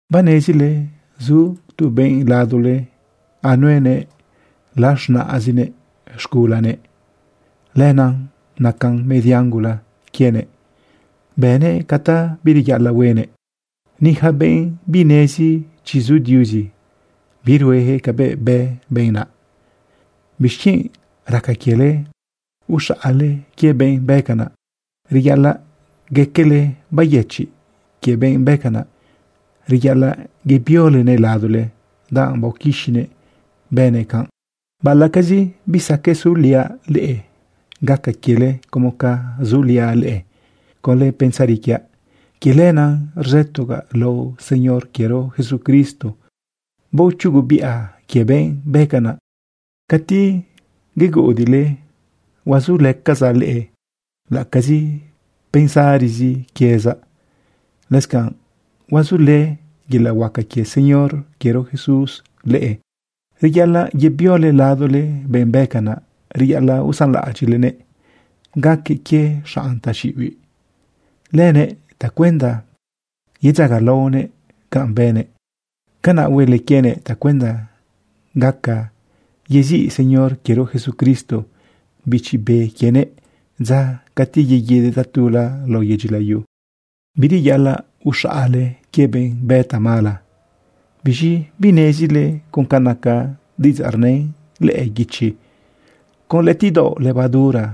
Banezile zu tu benꞌ ladole anuenëꞌ laz̃naꞌzinëꞌ z̃gulanëꞌ. Lenaꞌ nacan median gula quienëꞌ, bënëꞌ ca ta bireyaꞌalaꞌ huenëꞌ. Ni yaca benꞌ binezi chi zu Diuzi, birueyaquëꞌ cabëꞌ bë benꞌ naꞌ. ¿Bixquienꞌ raca quiele uxaꞌale quie benꞌ bë canaꞌ? ¡Reyaꞌalaꞌ gaquele bayëchiꞌ quie benꞌ bë canꞌ! Reyaꞌalaꞌ yebiolenëꞌ ladole, danꞌ baoquixinëꞌ bënëꞌ canꞌ. Baꞌalaꞌcazi bisaqueꞌ suliaꞌ leꞌe, gaca quiele como ca zuliaꞌ leꞌe conlë pensari quiaꞌ. Quie lenaꞌ rzëtogaꞌ lao Señor quiero Jesucristo baochugubiꞌa quie benꞌ bë canaꞌ. Cati yeguꞌudiꞌle huazulëcazaꞌ leꞌe laꞌacazi pensari quiezaꞌ. Lëscanꞌ huazulë yelaꞌ huaca quie Señor quiero Jesús leꞌe. Reyaꞌalaꞌ yebiole ladole benꞌ bë canaꞌ. Reyaꞌalaꞌ usanlaꞌadyiꞌlenëꞌ gaque quie xanꞌ taxiꞌibiꞌ lënëꞌ tacuenda yedzagalaonëꞌ canꞌ bënëꞌ. Canaꞌ huele quienëꞌ tacuenda gaca yeziꞌ Señor quiero Jesucristo bichi be quienëꞌ dza cati yeguidëꞌ tatula lao yedyi layu. Bireyaꞌalaꞌ uxaꞌale quie benꞌ bë tamala. ¿Biz̃i binezile con ca naca diꞌidzaꞌ rnën lëꞌë guichi: “Con lëꞌëtiꞌdaoꞌ levadura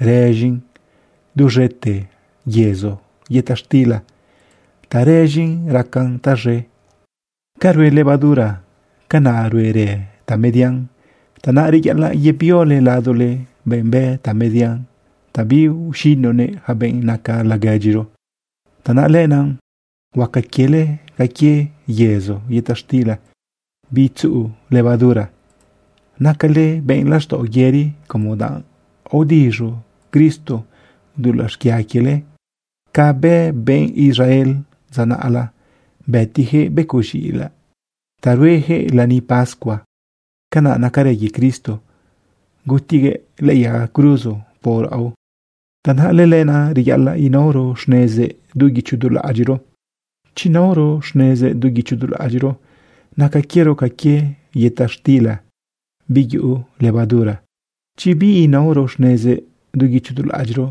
rëz̃in duz̃ete yezo yëta xtila ta rëz̃in racan taz̃e”? Ca rue levadura, canaꞌ ruerë tamedian. Tanaꞌ reyaꞌalaꞌ yebiole ladole benꞌ bë tamedian ta biuxinunëꞌ yaca benꞌ naca laguedyiro. Tanaꞌ lenaꞌ huaca quiele ca quie yezo yëta xtila bitzuꞌu levadura. Nacale benꞌ laxtaꞌo yëri como danꞌ aodiz̃u Cristo dulaꞌ xquia quiele. Ca bë benꞌ Israel dza naꞌla, bëtiyaquëꞌ becoꞌ z̃iꞌilaꞌ ta rueyaquëꞌ lani pascua, canaꞌ nacarë quie Cristo, gutiguëꞌ lëꞌë yaga cruzo por raꞌo. Tanaꞌ lëlenaꞌ reyaꞌalaꞌ inaoro xnezëꞌ du guicho du laꞌadyiꞌro. Chi naoro xnezëꞌ du guicho du laꞌadyiꞌro, naca quiero ca quie yëta xtila biyuꞌu levadura. Chi biinaoro xnezëꞌ du guicho du laꞌadyiꞌro,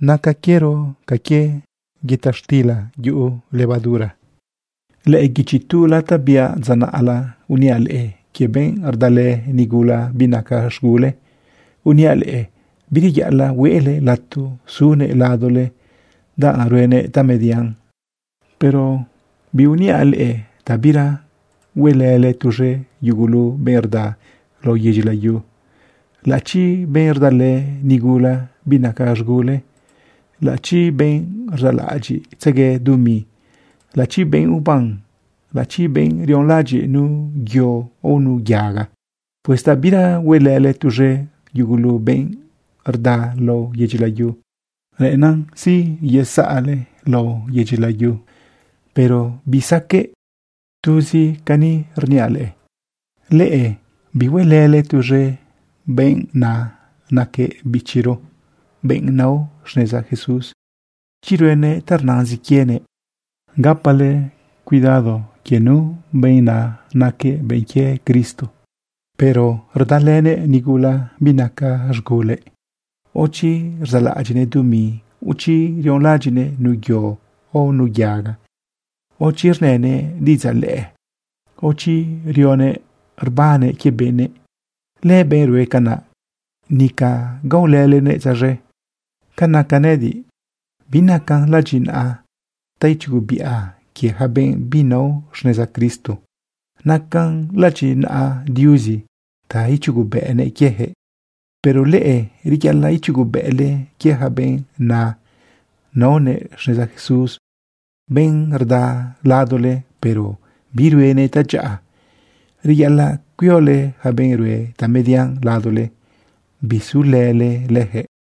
naca quiero ca quie yëta xtila yuꞌu levadura. Lëꞌë guichi tula ta biaꞌ dza naꞌla, uniaꞌ leꞌe quie benꞌ rdalë nigula binaca z̃gulëꞌ. Uniaꞌ leꞌe bireyaꞌalaꞌ huele lato sunëꞌ ladole danꞌ ruenëꞌ tamedian. Pero biuniaꞌ leꞌe ta bira huelële tuz̃e yugulu benꞌ rda lao yedyi layu, laꞌachi benꞌ rdalë nigula binaca z̃gulëꞌ, laꞌachi benꞌ rzaꞌlaꞌadyiꞌtzegue dumi, laꞌachi benꞌ uban, laꞌachi benꞌ rionlaꞌadyiꞌ nu yo o nu yaga. Pues ta bira huelële tuz̃e yugulu benꞌ rda lao yedyi layu, reꞌennan ziyezaꞌle lao yedyi layu, pero bisaqueꞌ. Tuz cani rniaꞌ leꞌe, bihuelële tuz̃e benꞌ na naquëꞌ bichiro benꞌ nao xneza Jesús chi ruenëꞌ ta rnazin quienëꞌ. Gapale cuidado quie nu benꞌ na naquëꞌ benꞌ quie Cristo, pero rdalënëꞌ nigula binaca z̃gulëꞌ, o chi rzaꞌlaꞌadyiꞌnëꞌ dumi, o chi rionlaꞌadyiꞌnëꞌ nu yo o nu yaga, o chi rnënëꞌ diꞌidzaꞌ lëꞌë, o chi riꞌoguëꞌ rbannëꞌ quie benëꞌ. Lëbenꞌ rue canaꞌ, nica gaolëlenëꞌ tzaz̃e. Ca naca nëꞌëdiꞌ, binacan ladyinaꞌa ta ichugubiꞌa quie yaca benꞌ binao xneza Cristo. Nacan ladyinaꞌa Diuzi ta ichugubëꞌnëꞌ quiejëꞌ. Pero leꞌe, reyaꞌalaꞌ ichugubëꞌle quie yaca benꞌ na naonëꞌ xneza Jesús, benꞌ rda ladole, pero biruenëꞌ tadyaꞌa. Reyaꞌalaꞌ cuiole yaca benꞌ rue tamedian ladole, bisulële lëjëꞌ.